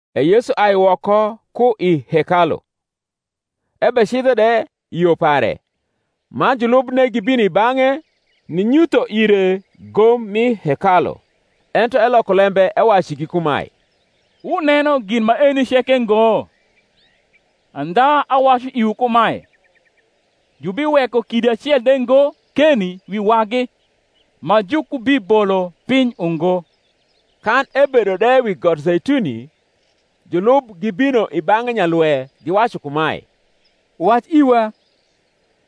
E Yesu ai woko ku i hekalu, ebecidho de i yo pare; man julubne gibino i bang’e ninyutho ire gom mi hekalu. Ento eloko lembe ewacu igi kumae, Wuneno gin maeni ceke ngo? andha awacu iwu kumae, Jubiweko kidi acel de ngo keni wi wagi ma jukubibolo piny ungo. Kan ebedo de wi got Zeituni, julub gibino i bang’e nyalwe, giwacu kumae, Wac iwa,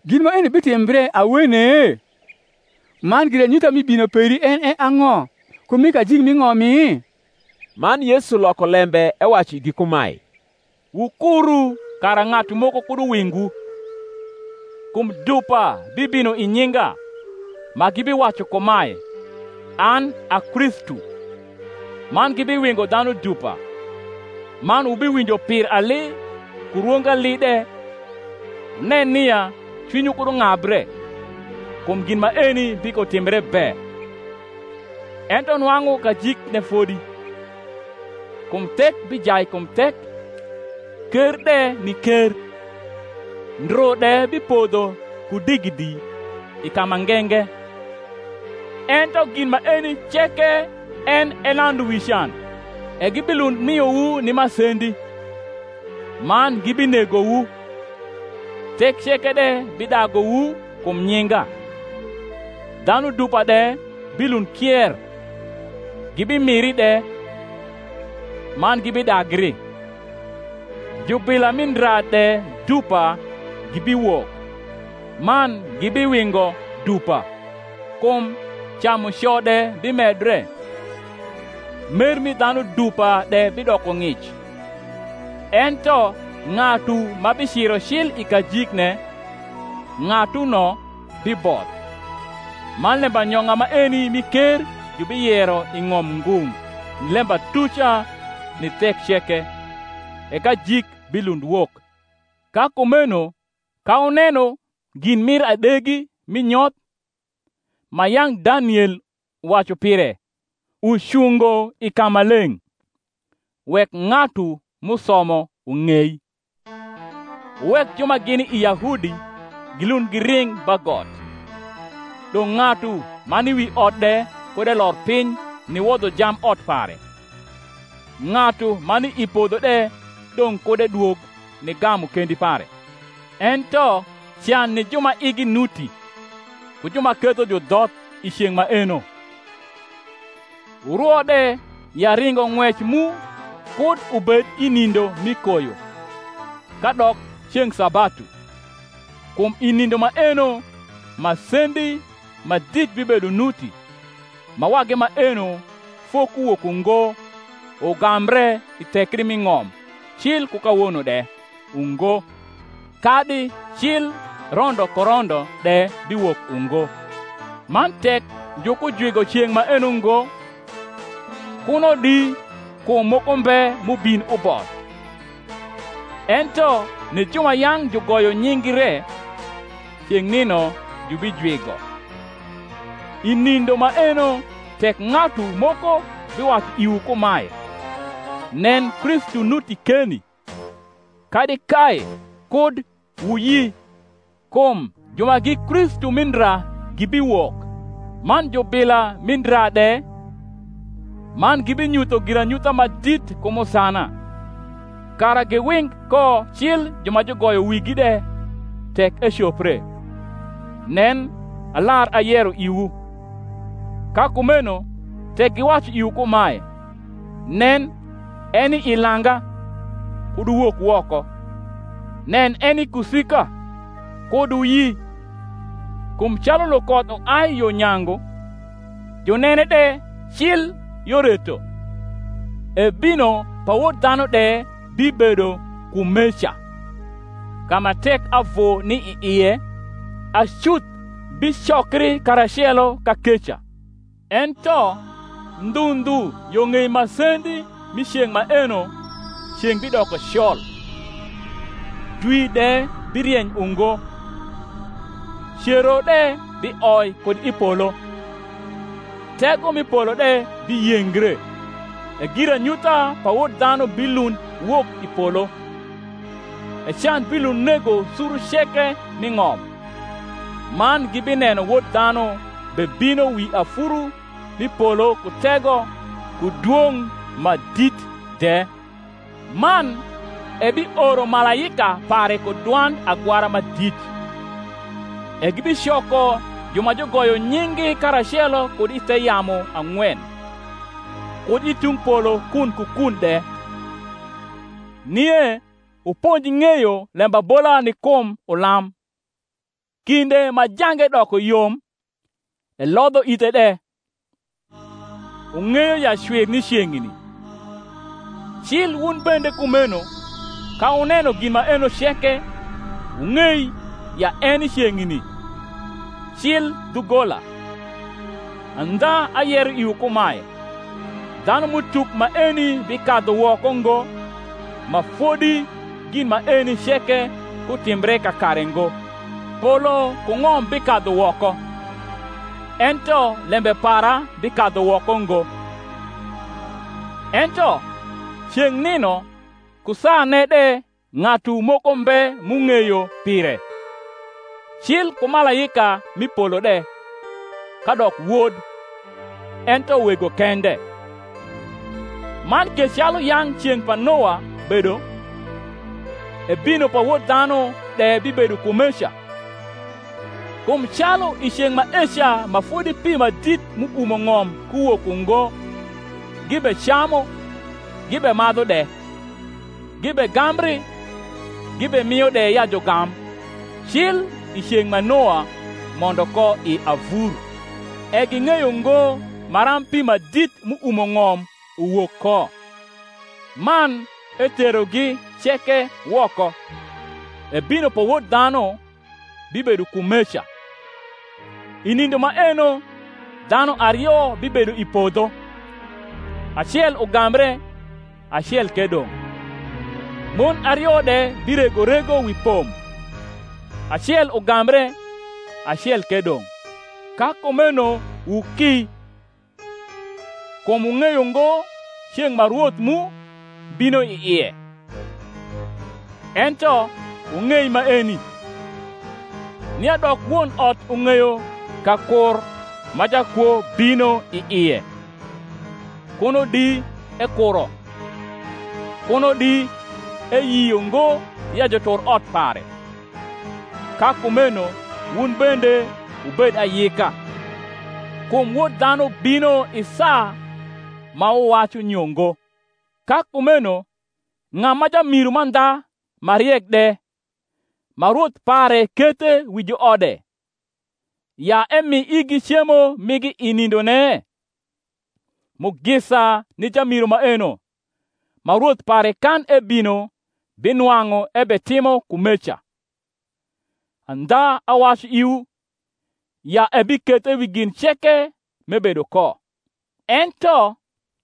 gin maeni bitimbre awene? man giranyutha mi bino peri en e ang’o, ku mi kajik mi ng’omi? Man Yesu loko lembe ewacu igi kumae, Wukuru kara ng’atu moko kud uwingwu. Kum dupa bibino i nyinga, ma gibiwacu kumae, An a Kristu; man gibiwingo dhanu dupa. Man wubiwinjo pir ali ku rwong ali de; wunen nia cwinywu kud ung’abre: kum gin maeni bikotimbre be; ento nwang’u kajikne fodi. Kum thek bijai kum thek, ker de ni ker; ndru de bipodho ku digidi i ka ma nge nge. Ento gin maeni ceke en e landu wi can. E gibilund miowu ni masendi, man gibinegowu: thek ceke de bidaguwu kum nyinga. Dhanu dupa de bilund kier, gibimiri de, man gibidagri. Jubila mi ndra de dupa gibiwok, man gibiwingo dupa. Kum camuco de bimedre, mer mi dhanu dupa de bidoko ng’ic. Ento ng’atu ma biciro cil i kajikne, ng’atuno biboth. Man lembanyong’a maeni mi ker jubiyero i ng’om ngung’ ni lembatuca ni thek ceke; e kajik bilund wok. Ka kumeno ka wuneno gin mir adegi mi nyoth, ma yang’ Daniel wacu pire, ucungo i kamaleng’ (wek ng’atu m’usomo ung’ei), wuwek ju ma gini i Yahudi gilund giring ba got: dong’ ng’atu ma ni wi ot de kud elor piny niwodho jamb ot pare: ng’atu ma ni i podho de dong’ kud edwog nigamu kendi pare. Ento can ni ju ma igi nuti ku ju ma ketho judhoth i ceng’ maeno! Wurwo de ya ringong’wec mu kud ubed i nindo mi koyo, kadok ceng’ sabatu: kum i nindo maeno masendi ma dit bibedo nuti, ma wagi maeno fokuwok ungo ugambre i thekri mi ng’om cil ku kawono de, ungo, kadi cil rondo ku rondo de biwok ungo. Man tek jukujwigo ceng’ maeno ngo, kuno di kum moko mbe m’ubin uboth: ento ni ju ma yang’ jugoyo nying’gi re ceng’ nino jubijwigo. I nindo maeno tek ng’atu moko biwacu iwu kumae, Nen, Kristu nuti keni, kadi, Kae; kud wuyi. Kum ju ma gi Kristu rni ndra gibiwok, man jubila mi ndra de, man gibinyutho giranyutha ma dit ku musana; kara giwing ko cil ju ma jugoyo wigi de, tek ecopre. Nen, alar ayero iwu. Ka kumeno tek giwacu iwu kumae, Nen, eni i langa; kud wuwok woko: Nen, eni i kusika; kud wuyi. Kum calu lukoth uai yo nyangu, junene de cil yo reto; e bino pa Wod dhanu de bibedo kumeca. Ka ma tek avu ni i ie acuth bicokri karacelo kakeca. Ento ndhu ndhu yo ng’ei masendi mi ceng’ maeno ceng’ bidoko col, dwi de birieny ungo, cero de bioi kud i polo, tego mi polo de biyengre; e giranyutha pa Wod dhanu bilund wok i polo: e can bilund nego suru ceke m’i ng’om, man gibineno Wod dhanu bebino wi afuru m’i polo ku tego ku dwong’ ma dit de. Man ebioro malaika pare ku dwand agwara ma dit, e gibicoko ju ma jugoyo nying’gi karacelo kud i the yamu ang’wen, kud i tung polo kun ku kun de. Nie wuponj ng’eyo lembabola ni kum ulam: kmde ma jange doko yom, elodho ithe de, wung’eyo ya cwir ni ceng’ni; cil wun bende kumeno, ka wuneno gin maeno ceke, wung’ei ya eni ceng’ni, cil dhugola. Andha ayero iwu kumae, Dhanum’utuk maeni bikadhu woko ngo, ma fodi gin maeni ceke kutimbre kakare ngo. Polo ku ng’om bikadhu woko, ento lembe para bikadhu woko ngo. Ento ceng’ nino ku saane de ng’atu moko mbe m’ung’eyo pire, cil ku malaika m’i polo de, kadok Wod, ento Wego kende. Man ke calu yang’ ceng’ pa Noa bedo, e bino pa Wod dhanu de bibedo kumeca. Kum calu i ceng’ maeca ma fodi pi ma dit m’uumo ng’om kuwok ungo gibecamu gibemadhu de, gibegambri gibemio de ya jugam, cil i ceng’ ma Noa mondo ko i avur, e ging’eyo ngo maram pi ma dit m’uumo ng’om uwok ko, man eterogi ceke woko, e bino pa Wod dhanu bibedo kumeca. I nindo maeno dhanu ario bibedo i podho; acel ugambre, acel ke dong’: mon ario de birego rego wi pom: acel ugambre, acel ke dong’. Ka kumeno wuki: kum wung’eyo ngo ceng’ ma Rwoth mu bino i ie. Ento wung’ei maeni, nia dok won ot ung’eyo ka kur ma jakwo bino i ie, kuno di ekuro, kuno di eyio ngo ya jutur ot pare. Ka kumeno wun bende wubed ayika; kum Wod dhanu bino i saa ma wuwacu nyo ngo. Ka kumeno ng’a ma jamiru mandha ma riek de, ma rwoth pare kethe wi juode, ya emi igi cemo migi i nindone? Mugisa ni jamiru maeno, ma rwoth pare kan ebino binwang’u ebetimo kumeca. Andha awacu iwu, ya ebikethe wi gin ceke m’ebedo ko. Ento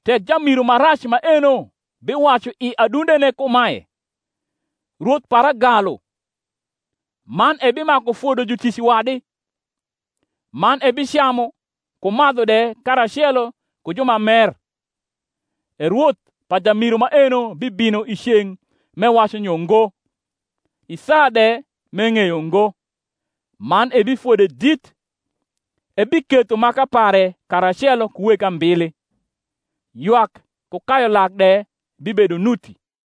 tek jamiru ma rac maeno biwacu i adundene kumae, Rwoth para galu: man ebimaku fodo jutic wadi, man ebicamu ku madhu de karacelo ku ju ma mer: e rwoth pa jamiru maeno bibino i ceng’ m’ewacu nyo ngo, i saa de m’eng’eyo ngo, man ebifode dit, ebiketho maka pare karacelo ku weg ambili: ywak ku kayu lak de bibedo nuti.